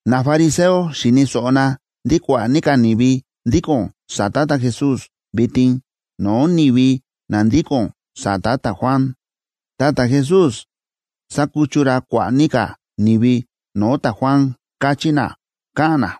Nafariseo xi̱ni̱ so̱ꞌo na ndí kua̱ꞌa̱ ní ka̱ ni̱vi ndíko̱n sa̱ta̱ ta̱Jesús vitin no̱o̱ ni̱vi na ndíko̱n sa̱ta̱ ta̱Juan, ta ta̱Jesús sákuchu ra kua̱ꞌa̱ ní ka̱ ni̱vi no̱o̱ ta̱Juan káchí na, káꞌa̱n na.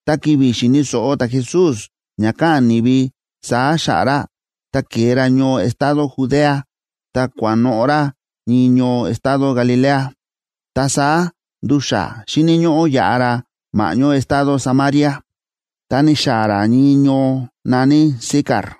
Ta ki̱vi̱ xi̱ni̱ so̱ꞌo ta̱Jesús ña káꞌa̱n ni̱vi saá xa̱ꞌa̱ ra, ta ke̱e ra ñoo estado Judea ta kua̱noꞌo̱ ra ñii ñoo estado Galilea. Ta saá ndu̱xa̱ xíni̱ ñóꞌó yaꞌa ra ma̱ꞌñó estado Samaria. Ta ni̱xaa̱ ra ñii ñoo na̱ní Sicar,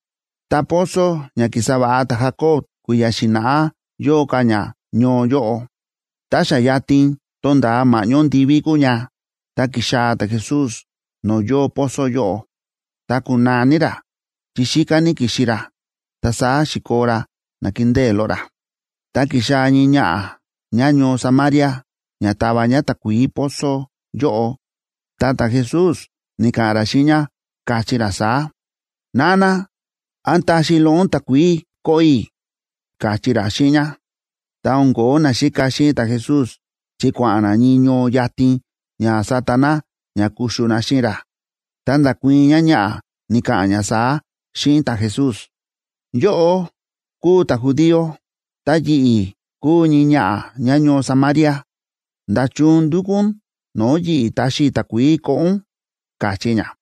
Ta pozo ña ki̱sa va̱ꞌa ta̱Jacob kui̱ya̱ xi̱na̱ꞌá yóo ka̱ ña ñoo yóꞌo. Ta xa yatin tónda̱a ma̱ꞌñó ndivíb kúu ña, ta ki̱xaa̱ ta̱Jesús no̱o̱ yóo pozo yóꞌo, ta kúnaa ní ra, chi xíká ní ki̱xi ra, ta saá xi̱koo ra nakindée loꞌo ra. Ta ki̱xaa̱ ñii ñaꞌa̱ ñáñoo Samaria ña tava ñá takuií pozo yóꞌo, ta ta̱Jesús ni̱ka̱ꞌa̱n ra xíꞌin ñá, káchí ra saá: ―Nana, ¿án taxi loꞌo ún takuií koꞌo i̱? ―káchí ra xíꞌin ñá. Ta o̱n ko̱ó naxíka xíꞌin ta̱Jesús, chi kua̱ꞌa̱n na ñii ñoo yatin ña sata na ña kuxu na xíꞌin ra. Ta nda̱kuii̱n ñáñaꞌa̱, ni̱ka̱ꞌa̱n ñá saá xíꞌin ta̱Jesús: ―Yóꞌó kúu ta̱judío ta yi̱ꞌi̱ kúu ñii ñaꞌa̱ ñáñoo Samaria. ¿Nda̱chun ndúkú ún no̱o̱ yi̱ꞌi̱ taxi i̱ takuií koꞌo ún? ―káchí ñá.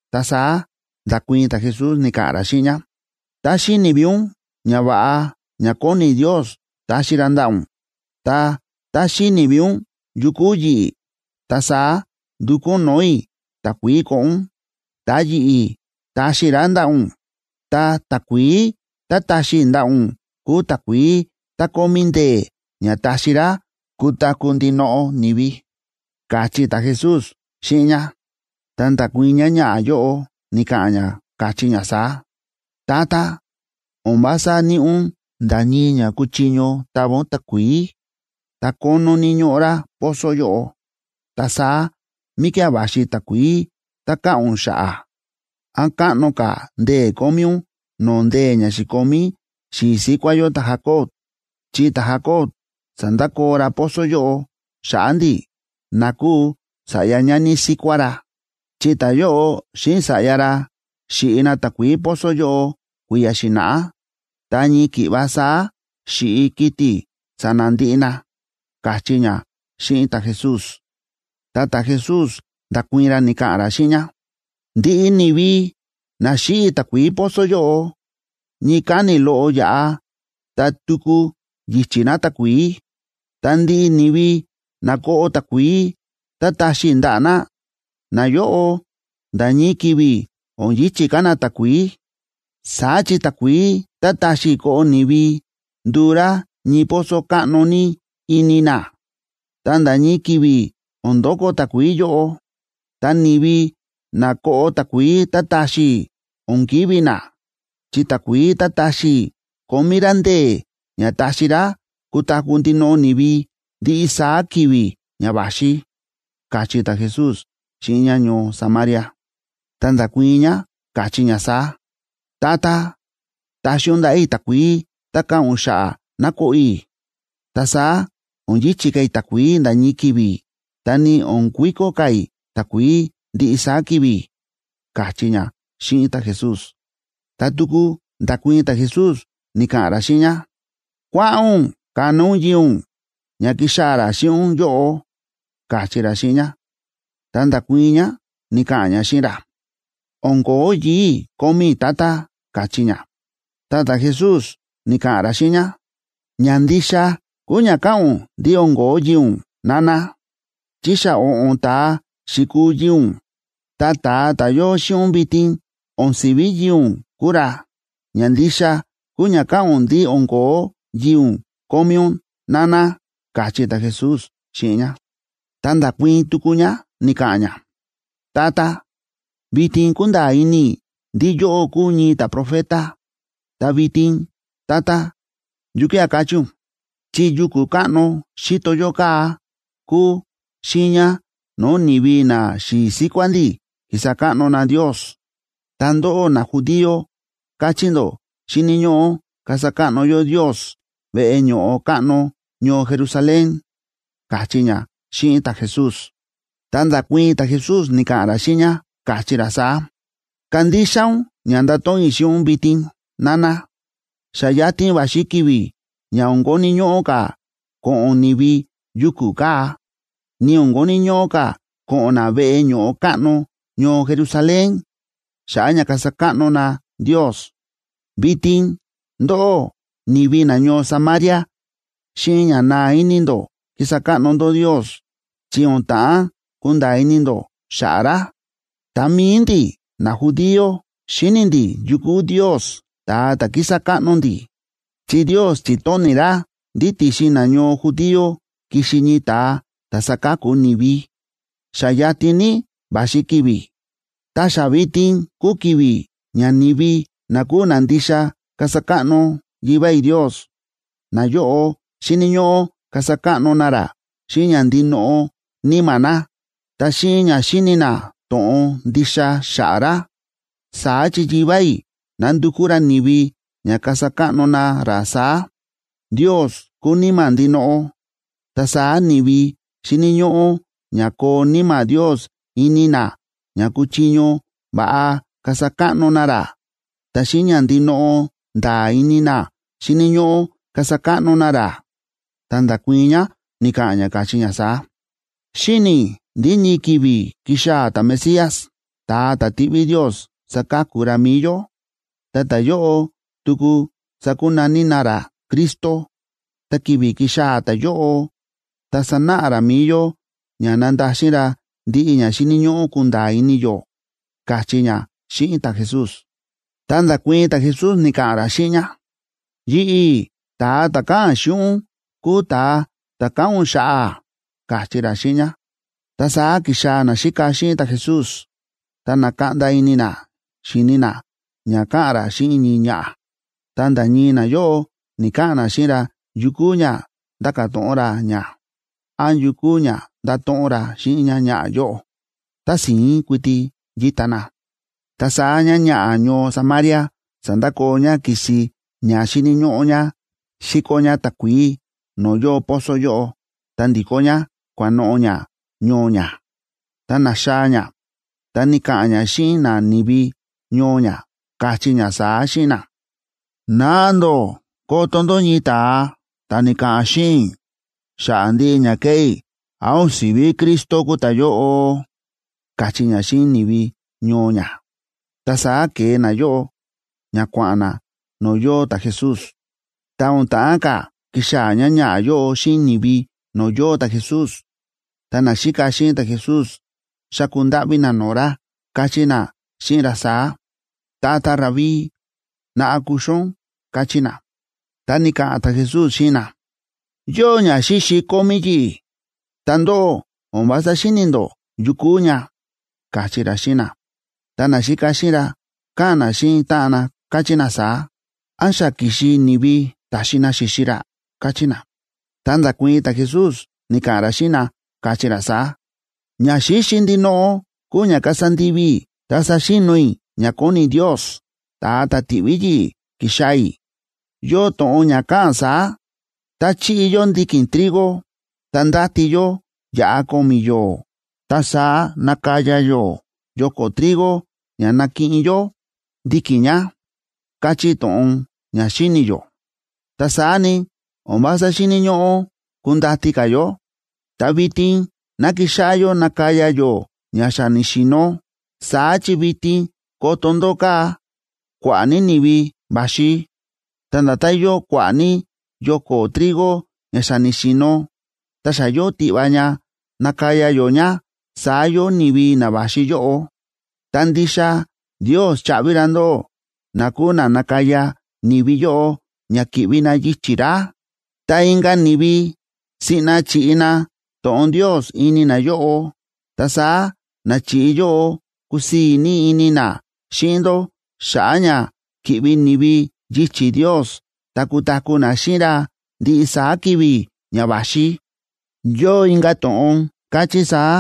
Ta saá nda̱kuii̱n ta̱Jesús, ni̱ka̱ꞌa̱n ra xíꞌin ñá: ―Tá xíni̱ ví ún ñava̱ꞌa ña kóni Ndios taxi ra ndaꞌa̱ ún, ta tá xíni̱ ví ún yu kúu yi̱ꞌi̱, ta saá ndukú ún no̱o̱ i̱ takuií koꞌo ún, ta yi̱ꞌi̱ taxi i̱ rá ndaꞌa̱ ún. Ta takuií tá taxi i̱ ndaꞌa̱ ún kúu takuií tá kómí ndee̱ ña taxi rá kutaku̱ ndinoꞌo ni̱vi ―káchí ta̱Jesús xíꞌin ñá. Ta nda̱kuii̱n ñáñaꞌa̱ yóꞌo, ni̱ka̱ꞌa̱n ñá, káchí ñá saá: ―Tata, o̱n vása níꞌi ún nda̱ ñii ña kuchiño tava ún takuií, ta kónó ní ñóꞌo rá pozo yóꞌo. Ta saá, ¿míkía̱ va̱xi takuií tá káꞌa̱n ún xa̱ꞌa̱? ¿Án káꞌno ka̱ ndee̱ kómí ún no̱o̱ ndee̱ ña xi̱komí xi̱i̱ síkuá yó ta̱Jacob?, chi ta̱Jacob sa̱ndakoo ra pozo yóꞌo xa̱ꞌa̱ ndi̱, na kúu sa̱ꞌya ñani síkuá ra, chi ta̱yóꞌo xíꞌin sa̱ꞌya ra xi̱ꞌi na takuií pozo yóꞌo kui̱ya̱ xi̱na̱ꞌá, ta ñii ki̱ꞌva saá xi̱ꞌi kiti̱ sa̱na̱ ndiꞌi na ―káchí ñá xíꞌin ta̱Jesús. Ta ta̱Jesús nda̱kuii̱n ra ni̱ka̱ꞌa̱n ra xíꞌin ñá: ―Ndiꞌi ni̱vi na xíꞌi takuií pozo yóꞌo, ñii káni̱ loꞌo yáꞌa, ta tuku yi̱chi̱ na takuií. Ta ndiꞌi ni̱vi na koꞌo takuií tá taxi i̱ ndaꞌa̱ na, nayóꞌo nda̱ ñii ki̱vi̱ o̱n yi̱chi̱ ka̱ na takuií. Saá chi takuií tá taxi i̱ koꞌo ni̱vi nduu rá ñii pozo káꞌno ní ini na, ta nda̱ ñii ki̱vi̱ o̱n ndoko takuií yóꞌo. Ta ni̱vi na koꞌo takuií tá taxi i̱ o̱n kivi̱ na, chi takuií tá taxi i̱ kómí rá ndee̱ ña taxi rá kutaku̱ ndinoꞌo ni̱vi ndiꞌi saá ki̱vi̱ ña va̱xi ―káchí ta̱Jesús xíꞌin ñáñoo Samaria. Ta nda̱kuii̱n ñá káchí ñá saá: ―Tata, taxi ún ndaꞌa̱ i̱ takuií tá káꞌa̱n ún xa̱ꞌa̱ ná koꞌo i̱. Ta saá o̱n yi̱chi̱ ka̱ i̱ takuií nda̱ ñii ki̱vi̱, ta ni o̱n kuiko ka̱ i̱ takuií ndiꞌi saá ki̱vi̱ ―káchí ñá xíꞌin ta̱Jesús. Ta tuku nda̱kuii̱n ta̱Jesús, ni̱ka̱ꞌa̱n ra xíꞌin ñá: ―Kua̱ꞌa̱n ún kana ún yii̱ ún, ña kixaa̱ ra xíꞌin ún yóꞌo ―káchí ra xíꞌin ñá. Ta nda̱kuii̱n ñá, ni̱ka̱ꞌa̱n ñá xíꞌin ra: ―O̱n ko̱ó yii̱ i̱ kómí i̱, tata ―káchí ñá. Ta ta̱Jesús ni̱ka̱ꞌa̱n ra xíꞌin ñá: ―Ña ndixa kúu ña káꞌa̱n ún ndí o̱n ko̱ó yii̱ ún, nana, chi xa o̱ꞌo̱n ta̱a xi̱kuu yii̱ ún, ta ta̱a ta̱ yóo xíꞌin ún vitin o̱n si̱ví yii̱ ún kúu ra. Ña ndixa kúu ña káꞌa̱n ún ndí o̱n ko̱ó yii̱ ún kómí ún, nana ―káchí ta̱Jesús xíꞌin ñá. Ta nda̱kuii̱n tuku ñá ni̱ka̱ꞌa̱n ñá: ―Tata, vitin kúnda̱a̱ ini i̱ ndí yóꞌó kúu ñii ta̱profeta. Ta vitin, Tata, ¿yukía̱ káchí ún?, chi yuku̱ káꞌno xíto yó kaa̱ kúu xiiña no̱o̱ ni̱vi naxi̱i̱ síkuá ndi̱ ki̱sa káꞌno na Ndios, ta ndóꞌó najudío káchí ndó xíni̱ ñóꞌó kasa káꞌno yó Ndios veꞌe ño̱ꞌo káꞌno ñoo Jerusalén ―káchí ñá xíꞌin ta̱Jesús. Ta nda̱kuii̱n ta̱Jesús, ni̱ka̱ꞌa̱n ra xíꞌin ñá, káchí ra saá: ―Kandixa ún ña ndato̱ꞌon i̱ xíꞌin ún vitin, nana. Xa yatin va̱xi ki̱vi̱ ña o̱n koni̱ ñóꞌó ka̱ ko̱ꞌo̱n ni̱vi yuku̱ kaa̱, ni o̱n koni̱ ñóꞌó ka̱ ko̱ꞌo̱n na veꞌe ño̱ꞌo káꞌno ñoo Jerusalén xa̱ꞌa̱ ña kasa káꞌno na Ndios. Vitin ndóꞌó, ni̱vi nañoo Samaria, xíꞌin ña naa ini ndó kísa káꞌno ndó Ndios, chi o̱n ta̱ꞌán kunda̱a̱ ini ndó xa̱ꞌa̱ ra. Ta mi̱i ndi̱ najudío xíni̱ ndí yu kúu Ndios ta̱a ta̱ kísa káꞌno ndi̱, chi Ndios chi̱tóni̱ ra ndí ti̱xin nañoo judío kixi ñii ta̱a ta̱ saka̱ku ni̱vi. Xa yatin ní va̱xi ki̱vi̱, ta xa vitin kúu ki̱vi̱ ña ni̱vi na kúu na ndixa kasa káꞌno Yivá i̱ Ndios, nayóꞌo xíni̱ ñóꞌó kasa káꞌno na ra xíꞌin ña ndinoꞌo níma̱ na, ta xíꞌin ña xíni̱ na to̱ꞌon ndixa xa̱ꞌa̱ ra. Saá chi Yivá i̱ nándukú ra ni̱vi ña kasa káꞌno na ra saá. Ndios kúu Níma̱ ndinoꞌo, ta saá ni̱vi xíni̱ ñóꞌó ña koo Níma̱ Ndios ini na ña kuchiño va̱ꞌa kasa káꞌno na ra, ta xíꞌin ña ndinoꞌo nda̱a̱ ini na xíni̱ ñóꞌó kasa káꞌno na ra. Ta nda̱kuii̱n ñá, ni̱ka̱ꞌa̱n ñá, káchí ñá saá: ―Xíni̱ i̱ ndí ñii ki̱vi̱ kixaa̱ ta̱Mesías, ta̱a ta̱ tiꞌví Ndios saka̱ku ra mi̱i yó. Ta ta̱yóꞌo tuku sákunaní na ra Cristo. Ta ki̱vi̱ kixaa̱ ta̱yóꞌo, ta sanáꞌa ra mi̱i yó ña nandaxin ra ndiꞌi ña xíni̱ ñóꞌó kunda̱a̱ ini yó ―káchí ñá xíꞌin ta̱Jesús. Ta nda̱kuii̱n ta̱Jesús ni̱ka̱ꞌa̱n ra xíꞌin ñá: ―Yi̱ꞌi̱, ta̱a ta̱ káꞌa̱n xíꞌin ún, kúu ta̱a ta̱ káꞌa̱n ún xa̱ꞌa̱ ―káchí ra xíꞌin ñá. Ta saá ki̱xaa̱ naxíka xíꞌin ta̱Jesús, ta na̱kaꞌnda ini na xi̱ni na ña káꞌa̱n ra xíꞌin ñii ñaꞌa̱. Ta nda̱ ñii nayóꞌo ni̱‑kaꞌa̱n na xíꞌin ra yu kúu ña ndáka̱ to̱ꞌon ra ñá, án yu kúu ña ndáto̱ꞌon ra xíꞌin ñáñaꞌa̱ yóꞌo. Tási̱ín kuiti yíta na. Ta saá ñáñaꞌa̱ ñoo Samaria sa̱ndakoo ñá ki̱si ña xíni̱ ñóꞌó ñá xíkó ñá takuií no̱o̱ yóo pozo yóꞌo, ta ndi̱kó ñá kua̱noꞌo̱ ñá ñoo ñá. Tá na̱xaa̱ ñá, ta ni̱ka̱ꞌa̱n ñá xíꞌin nani̱vi ñoo ñá, káchí ñá saá xíꞌin na: ―Naꞌa ndó koto ndó ñii ta̱a ta̱ ni̱ka̱ꞌa̱n xíꞌin i̱ xa̱ꞌa̱ ndiꞌi ña ke̱ꞌé i̱. ¿Án o̱n sivi Cristo kúu ta̱yóꞌo? ―káchí ñá xíꞌin ni̱vi ñoo ñá. Ta saá ke̱e nayóꞌo ña kua̱ꞌa̱n na no̱o̱ yóo ta̱Jesús. Ta o̱n ta̱ꞌán ka̱ kixaa̱ ñáñaꞌa̱ yóꞌo xíꞌin ni̱vi no̱o̱ yóo ta̱Jesús, ta naxíka xíꞌin ta̱Jesús xa̱ku ndáꞌví na no̱o̱ ra, káchí na xíꞌin ra saá: ―Tata Rabí, naꞌa kuxu ún ―káchí na. Ta ni̱ka̱ꞌa̱n ta̱Jesús xíꞌin na: ―Yóo ñaxíxi kómí yi̱ꞌi̱, ta ndóꞌó o̱n vása xíni̱ ndó yu kúu ña ―káchí ra xíꞌin na. Ta naxíka xíꞌin ra káꞌa̱n na xíꞌin táꞌan na, káchí na saá: ―¿Án xa ki̱xi ni̱vi ta̱xi na xi̱xi ra? ―káchí na. Ta nda̱kuii̱n ta̱Jesús, ni̱ka̱ꞌa̱n ra xíꞌin na, káchí ra saá: ―Ñaxíxi ndinoꞌo kúu ña kasa ndivi i̱ ta saxi̱no̱ i̱ ña kóni Ndios, ta̱a ta̱ ti̱ꞌví yi̱ꞌi̱ ki̱xaa̱ i̱. Yóo to̱ꞌon ña káꞌa̱n saá: “Tá chíꞌi yó ndiki̱n trigo, ta ndáti yó yaꞌa ko̱mi̱ yo̱o̱, ta saá nákaya yó yoko̱ trigo ña nakiꞌin yó ndiki̱n ña”, káchí to̱ꞌon ña xíni̱ yó. Ta saá ni, o̱n vása xíni̱ ñóꞌó kundati ka̱ yó, ta vitin ná kixáꞌá yó nakaya yó ña xa ni̱xi̱no̱. Saá chi vitin koto ndó kaa̱, kua̱ꞌa̱ ní ni̱vi va̱xi. Ta nda̱tán yóo kua̱ꞌa̱ ní yoko̱ trigo ña xa ni̱xi̱no̱, ta xa yóo tiꞌva ña nakaya yó ña, saá yóo ni̱vi na va̱xi yóꞌo. Ta ndixa Ndios chaꞌvi ra ndóꞌó na kúu na nakaya ni̱vi yóꞌo ña ki̱ꞌvi na yichi̱ ra. Ta inka̱ ni̱vi siꞌna chi̱ꞌi na to̱ꞌon Ndios ini nayóꞌo, ta saá na chi̱ꞌi yóꞌo kusii̱ ní ini na xíꞌin ndó xa̱ꞌa̱ ña ki̱ꞌvi ni̱vi yichi̱ Ndios ta kutaku̱ na xíꞌin ra ndiꞌi saá ki̱vi̱ ña va̱xi. Yóo inka̱ to̱ꞌon káchí saá: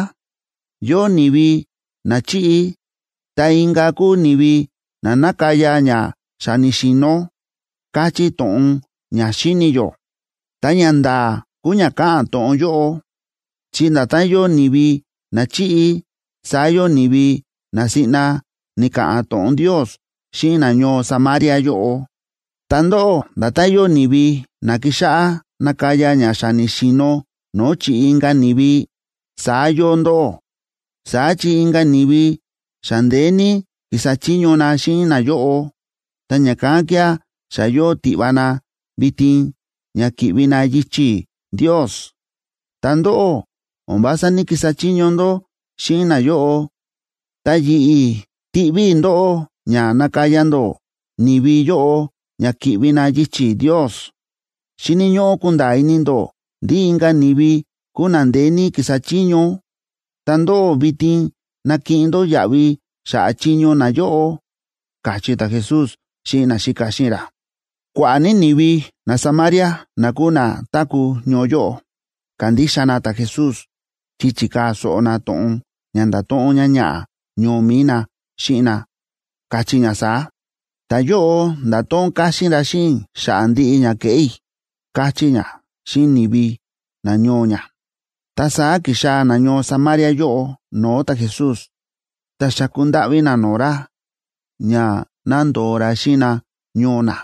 “Yóo ni̱vi na chíꞌi, ta inka̱ kúu ni̱vi na nákaya ña xa ni̱xi̱no̱”, káchí to̱ꞌon ña xíni̱ yó. Ta ñanda̱a̱ kúu ña káꞌa̱n to̱ꞌon yóꞌo, chi nda̱tán yóo ni̱vi na chi̱ꞌi, saá yóo ni̱vi na siꞌna ni̱ka̱ꞌa̱n to̱ꞌon Ndios xíꞌin nañoo Samaria yóꞌo. Ta ndóꞌó, nda̱tán yóo ni̱vi na ki̱xáꞌá nakaya ña xa ni̱xi̱no̱ no̱o̱ chi̱ꞌi inka̱ ni̱vi, saá yóo ndóꞌó. Saá chi inka̱ ni̱vi xa ndeé ní ki̱sa chiño na xíꞌin nayóꞌo, ta ña̱kán kía̱ xa yóo tiꞌva na vitin ña ki̱ꞌvi na yichi̱ Ndios. Ta ndóꞌó, o̱n vása ní‑kisa chiño ndó xíꞌin nayóꞌo, ta yi̱ꞌi̱ ti̱ꞌví i̱ ndóꞌó ña nakaya ndó ni̱vi yóꞌo ña ki̱ꞌvi na yichi̱ Ndios. Xíni̱ ñóꞌó kunda̱a̱ ini ndó ndí inka̱ ni̱vi kúu na ndeé ní ki̱sa chiño, ta ndóꞌó vitin nakiꞌin ndó yaꞌvi xa̱ꞌa̱ chiño nayóꞌo ―káchí ta̱Jesús xíꞌin naxíka xíꞌin ra. Kua̱ꞌa̱ ní ni̱vi naSamaria, na kúu na táku̱ ñoo yóꞌo, ka̱ndixa na ta̱Jesús chi chi̱kaa̱ so̱ꞌo na to̱ꞌon ña nda̱to̱ꞌon ñáñaꞌa̱ ñoo mi̱i na xíꞌin na, káchí ñá saá: “Ta̱yóꞌo nda̱to̱ꞌon káxín ra xíꞌin i̱ xa̱ꞌa̱ ndiꞌi ña ke̱ꞌé i̱”, káchí ñá xíꞌin ni̱vi nañoo ñá. Ta saá ki̱xaa̱ nañoo Samaria yóꞌo no̱o̱ ta̱Jesús, ta xa̱ku ndáꞌví na no̱o̱ ra ña ná ndo̱o ra xíꞌin na ñoo na,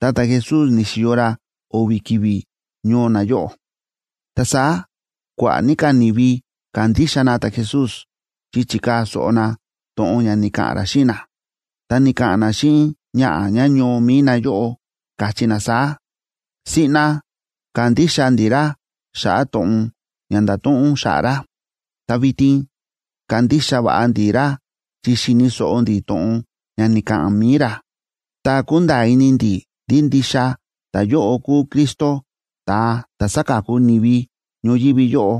ta ta̱Jesús ni̱xi̱yo ra o̱vi̱ ki̱vi̱ ñoo nayóꞌo. Ta saá kua̱ꞌa̱ ní ka̱ ni̱vi ka̱ndixa na ta̱Jesús chi chi̱kaa̱ so̱ꞌo na to̱ꞌon ña ni̱ka̱ꞌa̱n ra xíꞌin na. Ta ni̱ka̱ꞌa̱n na xíꞌin ñaꞌa̱ ñáñoo mi̱i na yóꞌo, káchí na saá: ―Siꞌna ka̱ndixa ndi̱ ra xa̱ꞌa̱ to̱ꞌon ña nda̱to̱ꞌon ún xa̱ꞌa̱ ra. Ta vitin kándixa va̱ꞌa ndi̱ ra chi xi̱ni̱ so̱ꞌo ndi̱ to̱ꞌon ña ni̱ka̱ꞌa̱n mi̱i ra, ta kúnda̱a̱ ini ndi̱ ndí ndixa ta̱yóꞌo kúu Cristo, ta̱a ta̱ saka̱ku ni̱vi ñoyívi yóꞌo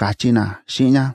―káchí na xíꞌin ñá.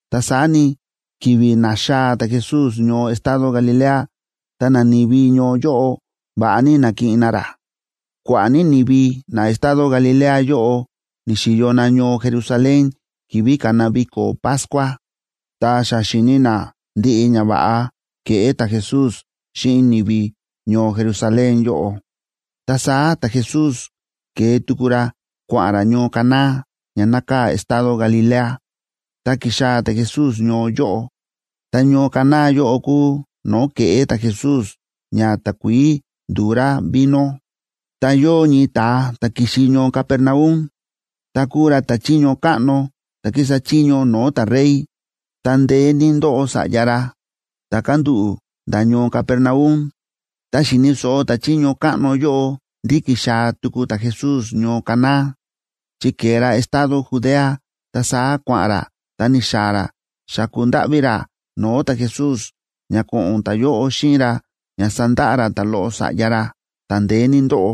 Ta saá ni, ki̱vi̱ na̱xaa̱ ta̱Jesús ñoo estado Galilea, ta nani̱vi ñoo yóꞌo va̱ꞌa ní na̱kiꞌin na ra. Kua̱ꞌa̱ ní ni̱vi na estado Galilea yóꞌo ni̱xi̱yo na ñoo Jerusalén ki̱vi̱ ka̱na viko̱ Pascua, ta xa xi̱ni na ndiꞌi ñava̱ꞌa ke̱ꞌé ta̱Jesús xíꞌin ni̱vi ñoo Jerusalén yóꞌo. Ta saá ta̱Jesús ke̱e tuku ra kua̱ꞌa̱n ra ñoo Caná ña nákaa̱ estado Galilea, ta ki̱xaa̱ ta̱Jesús ñoo yóꞌo. Ta ñoo Caná yóꞌo kúu no̱o̱ ke̱ꞌé ta̱Jesús ña takuií ndu̱u rá vino. Ta yóo ñii ta̱a ta̱ ki̱xi ñoo Capernaum, ta kúu ra ta̱chiño káꞌno ta̱ kísa chiño no̱o̱ ta̱rey, ta ndeé ní ndóꞌo sa̱ꞌya ra ta̱ kándúꞌu̱ nda̱ ñoo Capernaum. Tá xi̱ni̱ so̱ꞌo ta̱chiño káꞌno yóꞌo ndí ki̱xaa̱ tuku ta̱Jesús ñoo Caná, chi ke̱e ra estado Judea, ta saá kua̱ꞌa̱n ra ta ni̱xaa̱ ra xa̱ku ndáꞌví ra no̱o̱ ta̱Jesús ña ko̱ꞌo̱n ta̱yóꞌo xíꞌin ra ña sandaꞌa ra ta̱loꞌo sa̱ꞌya ra, ta̱ ndeé ní ndóꞌo,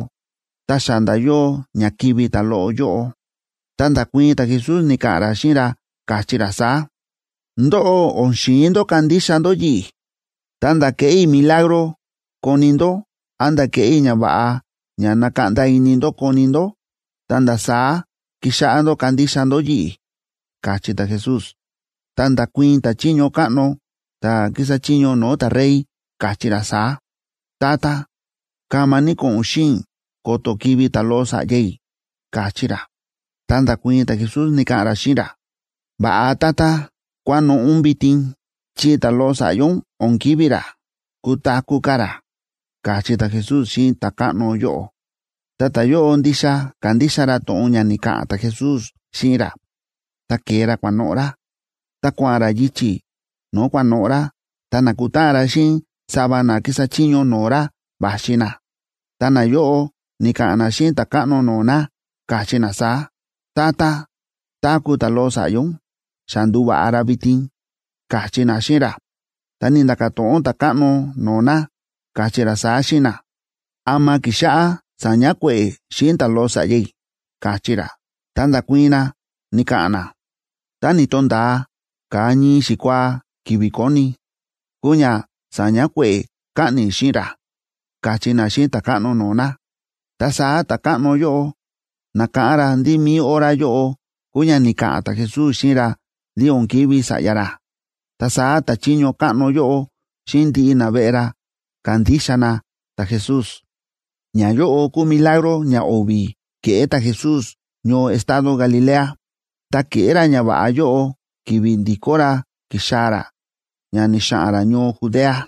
ta xa nda̱ yóo ña kivi̱ ta̱loꞌo yóꞌo. Ta nda̱kuii̱n ta̱Jesús ni̱ka̱ꞌa̱n ra xíꞌin ra, káchí ra saá: ―Ndóꞌó, o̱n xi̱in ndó kandixa ndó yi̱ꞌi̱. Ta̱nda̱ keꞌé i̱ milagro koni ndó, án nda̱ keꞌé i̱ ñava̱ꞌa ña nakaꞌnda ini ndó koni ndó, ta̱nda̱ saá kixáꞌá ndó kandixa ndó yi̱ꞌi̱ ―káchí ta̱Jesús. Ta nda̱kuii̱n ta̱chiño káꞌno ta̱ kísa chiño no̱o̱ ta̱rey, káchí ra saá: ―Tata, kama ní ko̱ꞌo̱n ún xíꞌin i̱ ko̱to̱ kivi̱ ta̱loꞌo sa̱ꞌya i̱ ―káchí ra. Ta nda̱kuii̱n ta̱Jesús, ni̱ka̱ꞌa̱n ra xíꞌin ra: ―Va̱ꞌa, tata, kua̱noꞌo̱ ún vitin, chi ta̱loꞌo sa̱ꞌya ún o̱n kivi̱ ra, kutaku̱ ka̱ ra ―káchí ta̱Jesús xíꞌin ta̱káꞌno yóꞌo. Ta ta̱yóꞌo ndixa ka̱ndixa ra to̱ꞌon ña ni̱ka̱ꞌa̱n ta̱Jesús xíꞌin ra, ta ke̱e ra kua̱noꞌo̱ ra. Tá kua̱ꞌa̱n ra yichi̱ no̱o̱ kua̱noꞌo̱ ra, ta na̱kutáꞌan ra xíꞌin sava na kísa chiño no̱o̱ ra va̱xi na. Ta nayóꞌo ni̱ka̱ꞌa̱n na xíꞌin ta̱káꞌno no̱o̱ na, káchí na saá: ―Tata, táku̱ ta̱loꞌo sa̱ꞌya ún, xa ndu̱va̱ꞌa ra vitin ―káchí na xíꞌin ra. Ta ni̱nda̱ka̱ to̱ꞌon ta̱káꞌno no̱o̱ na, káchí ra saá xíꞌin na: ―¿Ama ki̱xáꞌá saña kue̱ꞌe̱ xíꞌin ta̱loꞌo sa̱ꞌya i̱? ―káchí ra. Ta nda̱kuii̱n na, ni̱ka̱ꞌa̱n na: ―Tá ni̱to̱nda̱a ka̱a ñii xikuaa ki̱vi̱ konic kúu ña sa̱ña kue̱ꞌe̱ kaꞌni̱ xíꞌin ra ―káchí na xíꞌin ta̱káꞌno no̱o̱ na. Ta saá ta̱káꞌno yóꞌo na̱káꞌán ra ndí mi̱i hora yóꞌo kúu ña ni̱ka̱ꞌa̱n ta̱Jesús xíꞌin ra ndí o̱n kivi̱ sa̱ꞌya ra. Ta saá ta̱chiño káꞌno yóꞌo xíꞌin ndiꞌi naveꞌe ra ka̱ndixa na ta̱Jesús. Ñayóꞌo kúu milagro ñao̱vi̱ ke̱ꞌé ta̱Jesús ñoo estado Galilea, ta ke̱ꞌé ra ñava̱ꞌa yóꞌo ki̱vi̱ ndi̱kó ra ki̱xaa̱ ra, ña ni̱xa̱ꞌa̱n ra ñoo Judea.